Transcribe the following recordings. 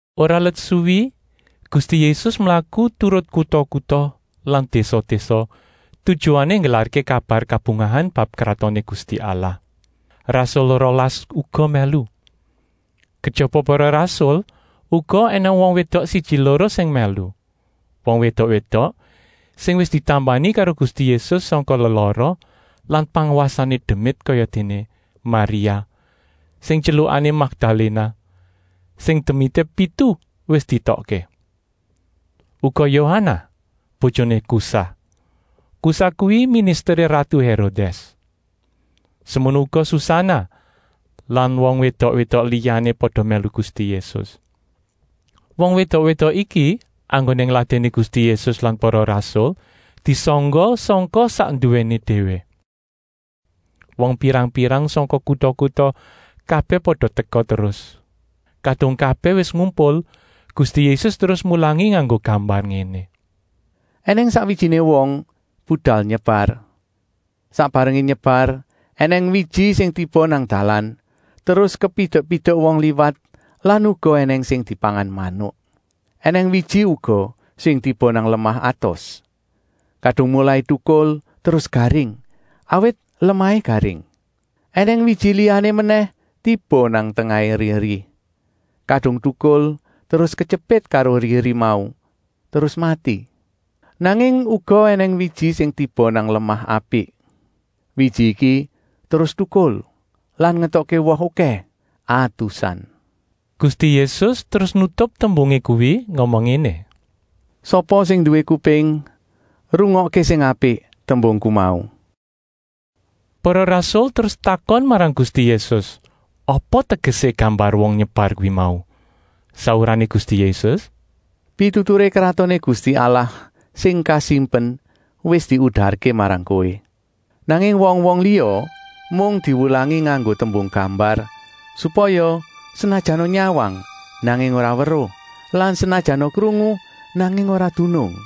Ora let suwi Gusti Yésus mlaku turut kuta-kuta lan désa-désa, tujuané nggelarké kabar kabungahan bab Kratoné Gusti Allah. Rasul rolas uga mèlu. Kejaba para rasul uga ènèng wong wédok siji-loro sing mèlu, wong wédok-wédok sing wis ditambani karo Gusti Yésus sangka lelara lan pangwasané demit kayadéné: Maria, sing tyelukané Makdaléna, sing demité pitu wis dietokké. Uga Yohanah, bojoné Kusah. Kusah kuwi ministeré ratu Hérodès. Semono uga Susanah lan wong wédok-wédok liyané pada mèlu Gusti Yésus. Wong wédok-wédok iki enggoné ngladèni Gusti Yésus lan para rasul disangga sangka sak nduwéné déwé. Wong pirang-pirang sangka kuta-kuta kabèh pada teka terus. Kadung kabèh wis ngumpul, Gusti Yésus terus mulangi nganggo gambar ngéné: “Enèng sakwijiné wong budal nyebar. Sak barengé nyebar ènèng wiji sing tiba nang dalan, terus kepidek-pidek wong liwat lan uga ènèng sing dipangan manuk. Enèng wiji uga sing tiba nang lemah atos. Kadung molai tukul terus garing, awit lemahé garing. Enèng wiji liyané menèh tiba nang tengahé eri-eri. Kadung tukul terus ketyepit karo eri-eri mau, terus mati. Nanging uga ènèng wiji sing tiba nang lemah apik. Wiji iki terus tukul lan ngetokké woh okèh, atusan.” Gusti Yésus terus nutup tembungé kuwi ngomong ngéné: “Sapa sing nduwé kuping, rungokké sing apik tembungku mau.” Para rasul terus takon marang Gusti Yésus apa tegesé gambar wong nyebar kuwi mau. Saurané Gusti Yésus: “Pituturé Kratoné Gusti Allah sing kasimpen wis diudarké marang kowé. Nanging wong-wong liya mung diwulangi nganggo tembung gambar, supaya, senajana nyawang, nanging ora weruh lan senajana krungu, nanging ora dunung.”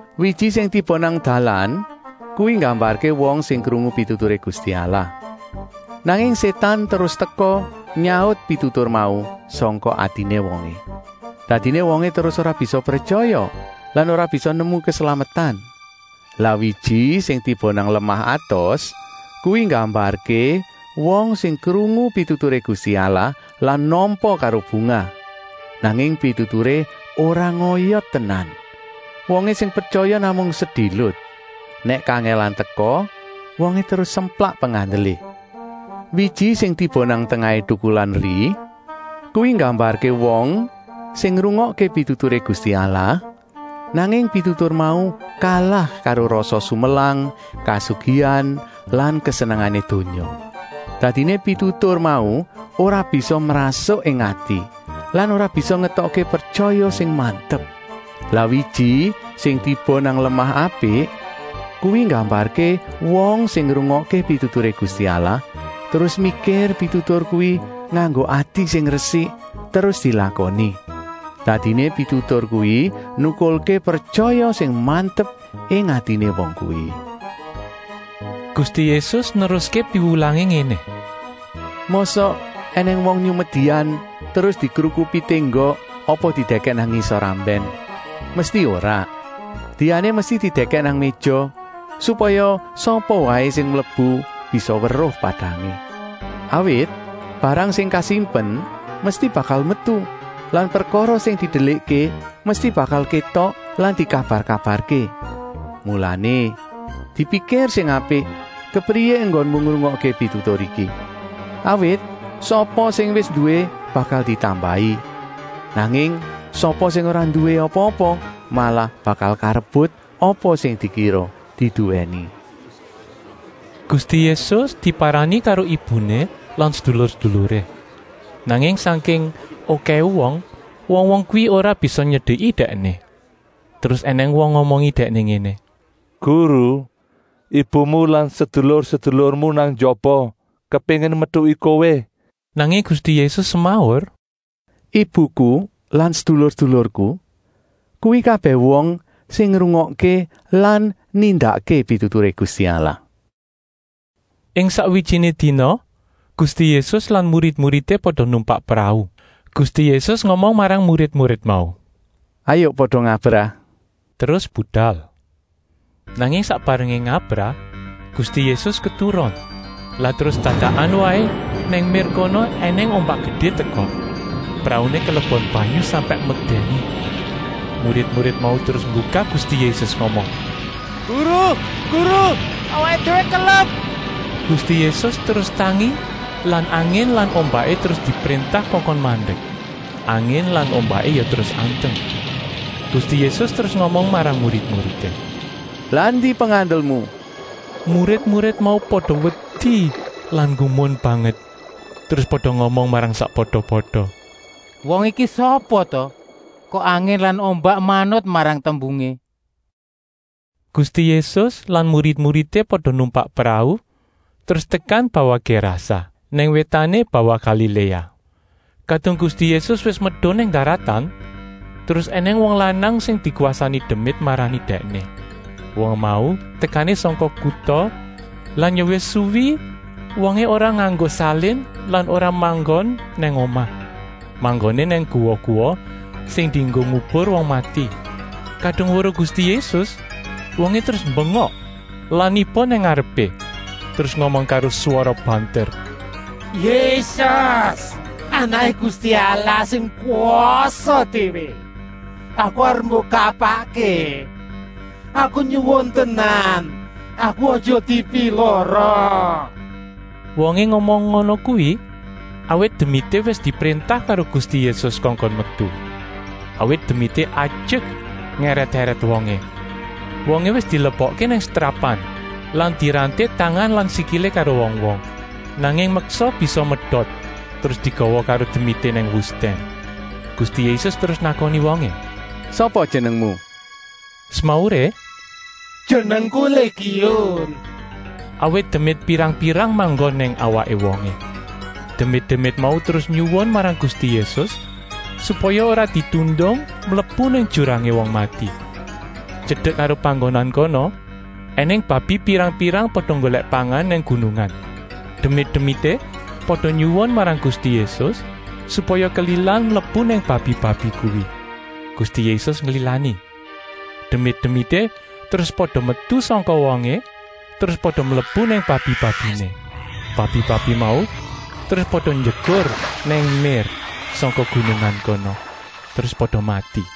Wiji sing tiba nang dalan kuwi nggambarké wong sing krungu pituturé Gusti Allah. Nanging Sétan terus teka nyaut pitutur mau sangka atiné wongé. Dadiné wongé terus ora bisa pretyaya lan ora bisa nemu keslametan. Lah wiji sing tiba nang lemah atos kuwi nggambarké wong sing krungu pituturé Gusti Allah lan nampa karo bungah. Nanging pituturé ora ngoyot tenan, wongé sing pretyaya namung sedilut. Nèk kangèlan teka, wongé terus semplak pengandelé. Wiji sing tiba nang tengahé tukulan eri kuwi nggambarké wong sing ngrungokké pituturé Gusti Allah, nanging pitutur mau kalah karo rasa sumelang, kasugihan lan kesenengané donya. Dadiné pitutur mau ora bisa mrasuk ing ati lan ora bisa ngetokké pretyaya sing mantep. Lah wiji sing tiba nang lemah apik kuwi nggambarké wong sing ngrungokké pituturé Gusti Allah, terus mikir pitutur kuwi nganggo ati sing resik, terus dilakoni. Dadiné pitutur kuwi nukulké pretyaya sing mantep ing atiné wong kuwi.” Gusti Yésus neruské piwulangé ngéné: “Mosok ènèng wong nyumet dian terus dikrukupi ténggok apa didèkèk nang ngisor ambèn? Mesti ora. Diané mesti didèkèk nang méja, supaya sapa waé sing mlebu bisa weruh padangé. “Awit barang sing kasimpen mesti bakal metu lan prekara sing didelikké mesti bakal kétok lan dikabar-kabarké. “Mulané, dipikir sing apik kepriyé enggonmu ngrungokké pitutur iki. Awit sapa sing wis nduwé bakal ditambahi, nanging sapa sing ora nduwé apa-apa malah bakal karebut apa sing dikira diduwèni.” Gusti Yésus diparani karo ibuné lan sedulur-seduluré, nanging sangking okèhé wong, wong-wong kuwi ora bisa nyedeki Dèkné. Terus ènèng wong ngomongi Dèkné ngéné: “Guru, ibumu lan sedulur-sedulurmu nang njaba, kepéngin metuki Kowé.” Nanging Gusti Yésus semaur: “Ibuku lan sedulur-sedulurku kuwi kabèh wong sing ngrungokké lan nindakké pituturé Gusti Allah.” Ing sakwijiné dina Gusti Yésus lan murid-muridé pada numpak prau. Gusti Yésus ngomong marang murid-murid mau: “Hayuk pada ngabrah.” Terus budal. Nanging sak barengé ngabrah Gusti Yésus keturon. Lah terus dadakan waé nang mér kono ènèng ombak gedé teka. Prauné kelebon banyu sampèk medèni. Murid-murid mau terus nggugah Gusti Yésus ngomong: “Guru, Guru, awaké déwé kelep!” Gusti Yésus terus tangi lan angin lan ombaké terus dipréntah kongkon mandek. Angin lan ombaké ya terus anteng. Gusti Yésus terus ngomong marang murid-muridé: “Lah endi pengandelmu?” Murid-murid mau pada wedi lan nggumun banget, terus pada ngomong marang sakpada-pada: “Wong iki sapa ta, kok angin lan ombak manut marang tembungé?” Gusti Yésus lan murid-muridé pada numpak prau terus tekan bawah Gérasa, nang wétané bawah Galiléa. Kadung Gusti Yésus wis medun nang daratan terus ènèng wong lanang sing dikwasani demit marani Dèkné. Wong mau tekané sangka kuta lan ya wis suwi wongé ora nganggo salin lan ora manggon nang omah. Manggoné nang guwa-guwa sing dienggo ngubur wong mati. Kadung weruh Gusti Yésus wongé terus mbengok lan niba nang ngarepé, terus ngomong karo swara banter: “Yésus, Anaké Gusti Allah sing kwasa déwé, aku arep mbok kapakké? Aku nyuwun tenan, aku aja dipilara.” Wongé ngomong ngono kuwi, awit demité wis dipréntah karo Gusti Yésus kongkon metu. Awit demité ajek ngèrèt-èrèt wongé. Wongé wis dilebokké nang setrapan lan diranté tangan lan sikilé karo wong-wong, nanging meksa bisa medot terus digawa karo demité nang wustèn. Gusti Yésus terus nakoni wongé: “Sapa jenengmu?” Semauré: “Jenengku Légiun,” awit demit pirang-pirang manggon nang awaké wongé. Demit-demit mau terus nyuwun marang Gusti Yésus, supaya ora ditundung mlebu nang jurangé wong mati. Tyedek karo panggonan kono ènèng babi pirang-pirang pada nggolèk pangan nang gunungan. Demit-demité pada nyuwun marang Gusti Yésus, supaya kelilan mlebu nang babi-babi kuwi. Gusti Yésus nglilani. Demit-demité terus pada metu sangka wongé, terus pada mlebu nang babi-babiné. Babi-babi mau terus pada njegur nang mér sangka gunungan kono, terus pada mati.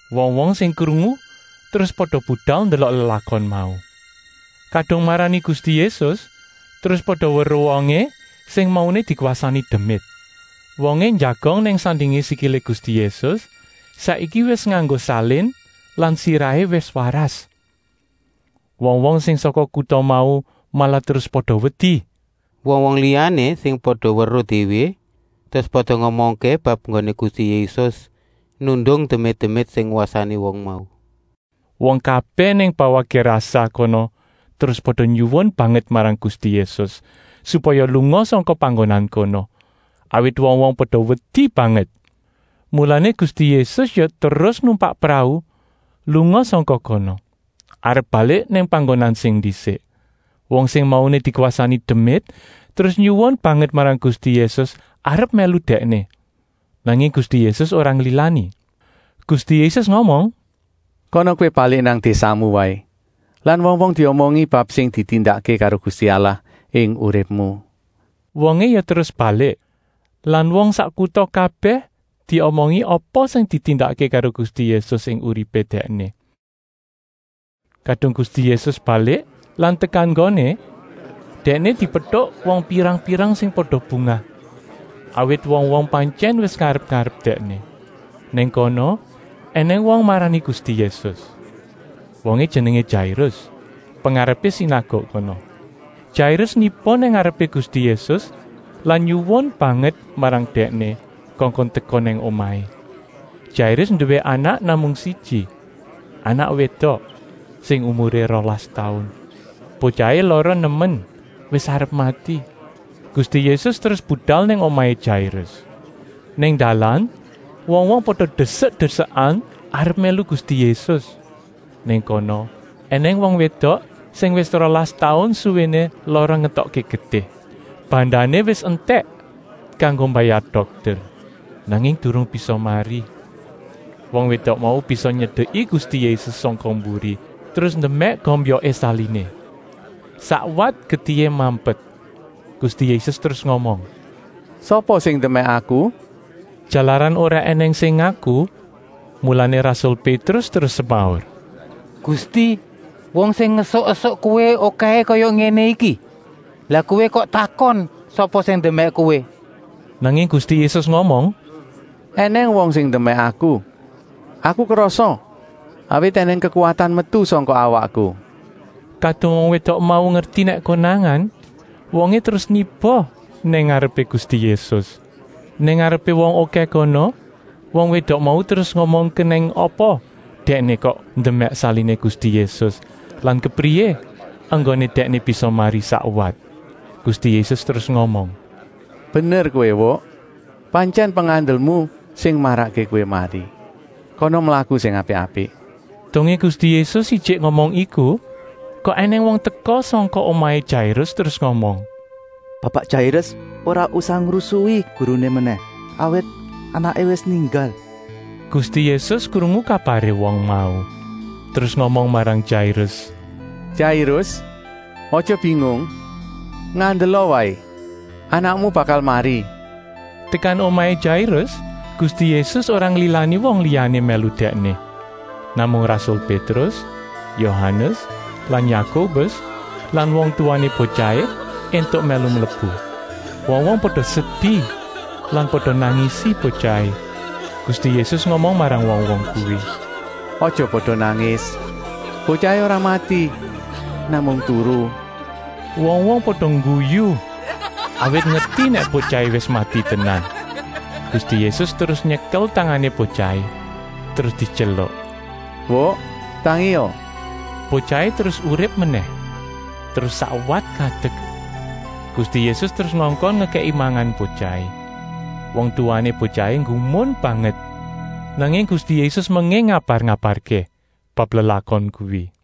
Wong-wong sing krungu terus pada budal ndelok lelakon mau. Kadung marani Gusti Yésus terus pada weruh wongé sing mauné dikwasani demit. Wongé njagong nang sandingé sikilé Gusti Yésus, saiki wis nganggo salin lan sirahé wis waras. Wong-wong sing sangka kuta mau malah terus pada wedi. Wong-wong liyané sing pada weruh déwé terus pada ngomongké bab enggoné Gusti Yésus nundung demit-demit sing ngwasani wong mau. Wong kabèh nang bawah Gérasa kono terus pada nyuwun banget marang Gusti Yésus, supaya lunga sangka panggonan kono, awit wong-wong pada wedi banget. Mulané Gusti Yésus ya terus numpak prau lunga sangka kono, arep balik nang panggonan sing ndisik. Wong sing mauné dikwasani demit terus nyuwun banget marang Gusti Yésus arep mèlu Dèkné. Nanging Gusti Yésus ora nglilani. Gusti Yésus ngomong: “Kana kowé balik nang désamu waé lan wong-wong diomongi bab sing ditindakké karo Gusti Allah ing uripmu.” Wongé ya terus balik lan wong sak kuta kabèh diomongi apa sing ditindakké karo Gusti Yésus ing uripé dèkné. Kadung Gusti Yésus balik lan tekan nggoné, Dèkné dipetuk wong pirang-pirang sing pada bungah, awit wong-wong pantyèn wis ngarep-arep Dèkné. Nang kono ènèng wong marani Gusti Yésus. Wongé jenengé Jairus, pengarepé sinaguk kono. Jairus niba nang ngarepé Gusti Yésus lan nyuwun banget marang Dèkné kongkon teka nang omahé. Jairus nduwé anak namung siji, anak wédok sing umuré rolas taun. Botyahé lara nemen, wis arep mati. Gusti Yésus terus budal nang omahé Jairus. Nang dalan wong-wong pada desek-desekan arep mèlu Gusti Yésus. Nang kono ènèng wong wédok sing wis rolas taun suwéné lara ngetokké getih. Bandané wis entèk kanggo mbayar dokter, nanging durung bisa mari. Wong wédok mau bisa nyedeki Gusti Yésus sangka mburi, terus ndemèk gombyoké saliné. Sakwat getihé mampet. Gusti Yésus terus ngomong: “Sapa sing ndemèk Aku?” Jalaran ora ènèng sing ngaku, mulané rasul Pétrus terus semaur: “Gusti, wong sing ngesuk-esuk Kowé okèhé kaya ngéné iki, lah kok Kowé takon sapa sing ndemèk Kowé?” Nanging Gusti Yésus ngomong: “Enèng wong sing ndemèk Aku. Aku krasa, awit ènèng kekuwatan metu sangka awakku.” Kadung wong wédok mau ngerti nèk konangan, wongé terus niba nang ngarepé Gusti Yésus. Nang ngarepé wong okèh kono wong wédok mau terus ngomong kenèng apa dèkné kok ndemèk saliné Gusti Yésus lan kepriyé enggoné dèkné bisa mari sakwat. Gusti Yésus terus ngomong: “Bener kowé Wuk, pantyèn pengandelmu sing marakké kowé mari. Kana mlaku sing apik-apik.” Dongé Gusti Yésus ijik ngomong iku, kok ènèng wong teka sangka omahé Jairus terus ngomong: “Bapak Jairus ora usah ngrusui Guruné menèh, awit anaké wis ninggal!” Gusti Yésus krungu kabaré wong mau, terus ngomong marang Jairus: “Jairus, aja bingung, ngandela waé, anakmu bakal mari.” Tekan omahé Jairus Gusti Yésus ora nglilani wong liyané mèlu Dèkné. Namung rasul Pétrus, Yohanes lan Yakobus lan wong tuwané botyahé éntuk mèlu mlebu. Wong-wong pada sedi lan pada nangisi botyahé. Gusti Yésus ngomong marang wong-wong kuwi: “Aja pada nangis. Botyahé ora mati, namung turu!” Wong-wong pada ngguyu, awit ngerti nèk botyahé wis mati tenan. Gusti Yésus terus nyekel tangané botyahé, terus dityeluk: “Wuk, tangia!” Botyahé terus urip menèh, terus sakwat ngadek. Gusti Yésus terus ngongkon ngekèki mangan botyahé. Wong tuwané botyahé nggumun banget. Nanging Gusti Yésus menging ngabar-ngabarké bab lelakon kuwi.